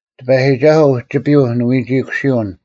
ᑎᐸᔨᒋᒐᓱᐤ ᐅᒋᐱᔪᐤ ᓂᐎᒋᐃᑯᓯᐅᓐ,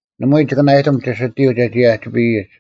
ᓇᒪᐎᔾ ᒋᑭ ᓇᐊᔨᑎᒻ ᒋᓯᑎᔪᐤ ᒐᒋ ᐊᒋᐱᔨᒡ: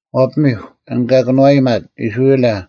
ᐛᐸᑎᒥᒄ, ᐊᓐ ᑲ ᑭᓄᐛᔨᒪᑦ ᐃᔅᕋᐃᓚ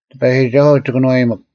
ᑎᐸᔨᒋᒐᓱᐤ ᒋ ᑭᓄᐛᔨᒥᒄ;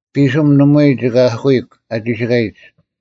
ᐱᓯᒻ ᓇᒪᐎᔾ ᒋᑭ ᐊᐧᑯᐃᒄ ᐊ ᒋᓯᑲᔨᒡ,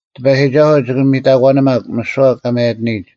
ᑎᐸᔨᒋᒐᓱᐤ ᒋᑭ ᒥᑕᒂᓂᒪᒄ ᒥᓯᐛ ᑲ ᒪᔭᑎᓂᔨᒡ: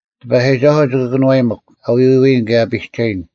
ᑎᐸᔨᒋᒐᓱᐤ ᒋᑭ ᑭᓄᐛᔨᒥᒄ ᐊ ᐎᐎᔨᓐ ᑭᔭ ᐊ ᐱᒐᔨᓐ,